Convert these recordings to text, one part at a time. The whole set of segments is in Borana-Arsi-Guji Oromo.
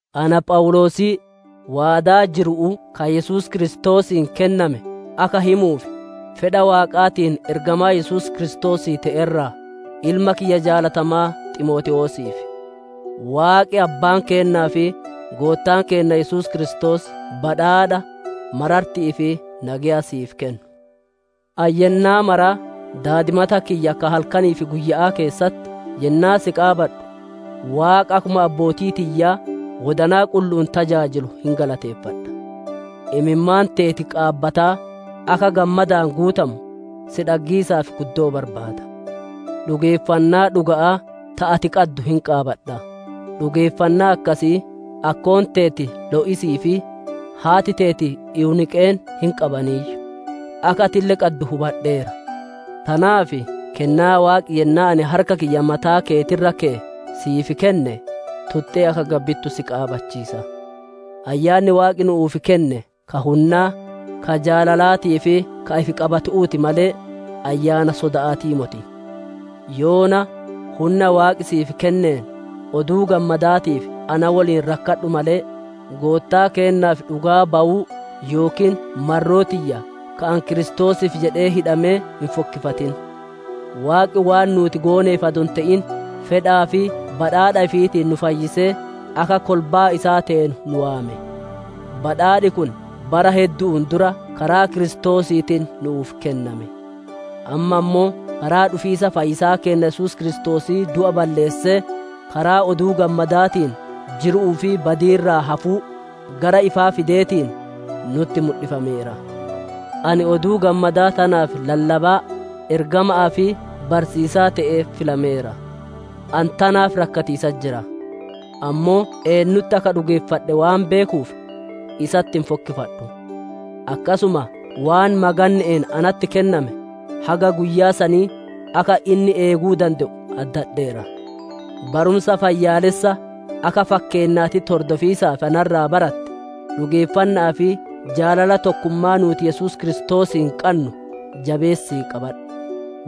Ana Phawuloosii, waadaa jiru'uu ka Yesuus Kiristoosiin kenname akka himuuf, fedha Waaqaatiin ergamaa Yesuus Kiristoosii te'e irraa: Ilma kiyya jaalatamaa Ximootewoosiif, Waaqi Abbaan keennaa fi Goottaan keenna Yesuus Kiristoos badhaadha, mararti'ii fi nageya siif kennu. Ani yennaa maraa daadimata kiyya ka halkanii fi guyya'aa keessatti yennaa si qaabadhu, Waaqa akkuma abbootii tiyyaa wodanaa qullu'uun tajaajilu hin galateeffadha. Imimmaan teeti qaabataa, akka gammadaan guutamu, si dhaggiisaaf guddoo barbaada. Dhugeeffannaa dhuga'aa ta ati qaddu hin qaabadha; dhugeeffannaa akkasii akkoon teeti Lo'isii fi haati teeti Ewuniiqeen hin qabaniiyyu. Akka atille qaddu hubadheera. Tanaaf kennaa Waaqi yennaa ani harka kiyya mataa keeti irra keye siif kenne, tuxxee akka gabbittu si qaabachiisa. Ayyaanni Waaqi nu'uuf kenne ka hunnaa, ka jaalalaatii fi ka ifi qabatu'uuti malee, Ayyaana soda'aatii moti. Yoona, hunna Waaqi siif kenneen, Oduu Gammadaatiif na woliin rakkadhu malee, Goottaa keennaaf dhugaa bayuu yookiin marroo tiyya ka ani Kiristoosiif jedhee hidhame hin fokkifatin. Waaqi waan nuuti gooneef adoo hin te'in, fedhaa fi badhaadha ifiitiin nu fayyisee akka kolbaa isaa teenu nu waame. Badhaadhi kun bara heddu'uun dura karaa Kiristoosiitiin nu'uuf kenname. Amma ammoo karaa dhufiisa fayyisaa keenna Yesuus Kiristoosii du'a balleessee, karaa Oduu Gammadaatiin jiru'uu fi badii irraa hafuu, gara ifaa fideetiin, nutti mudhifameera. Ani Oduu Gammadaa tanaaf lallabaa, ergama'aa fi barsiisaa te'ee filameera. Ani tanaaf rakkatiisatti jira. Ammoo eennutti akka dhugeeffadhe waan beekuuf isatti hin fokkifadhu; akkasuma waan maganne'een natti kenname, haga guyyaa sanii akka inni eeguu dande'u addadheera. Barumsa fayyaalessa akka fakkeennaatitti hordofiisaaf na irraa baratte, dhugeeffanna'aa fi jaalala tokkummaa nuuti Yesuus Kiristoosiin qannu jabeessii qabadhu.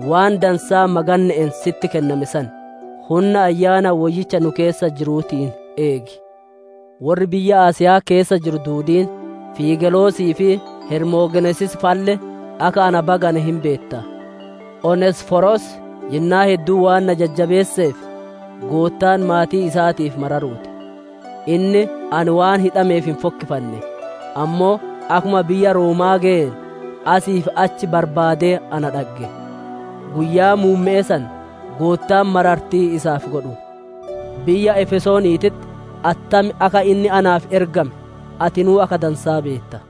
Waan dansaa maganne'een sitti kenname san, hunna Ayyaana Woyyicha nu keessa jiruutiin eegi. Worri biyya Asiya'aa keessa jiru duudiin, Fiigelosii fi Heromogenesis fa'alle akka na bagane hin beetta. Oneesiforos yennaa hedduu waan na jajjabeesseef, Goottaan maatii isaatiif mararuu ti. Inni ani waan hidhameef hin fokkifanne; ammoo akkuma biyya Rooma'aa geyeen, asii fi achi barbaadee na dhagge. Guyyaa muumme'ee san Goottaan marartii isaaf godhu. Biyya Efesooniititti attam akka inni naaf ergame atinuu akka dansaa beetta.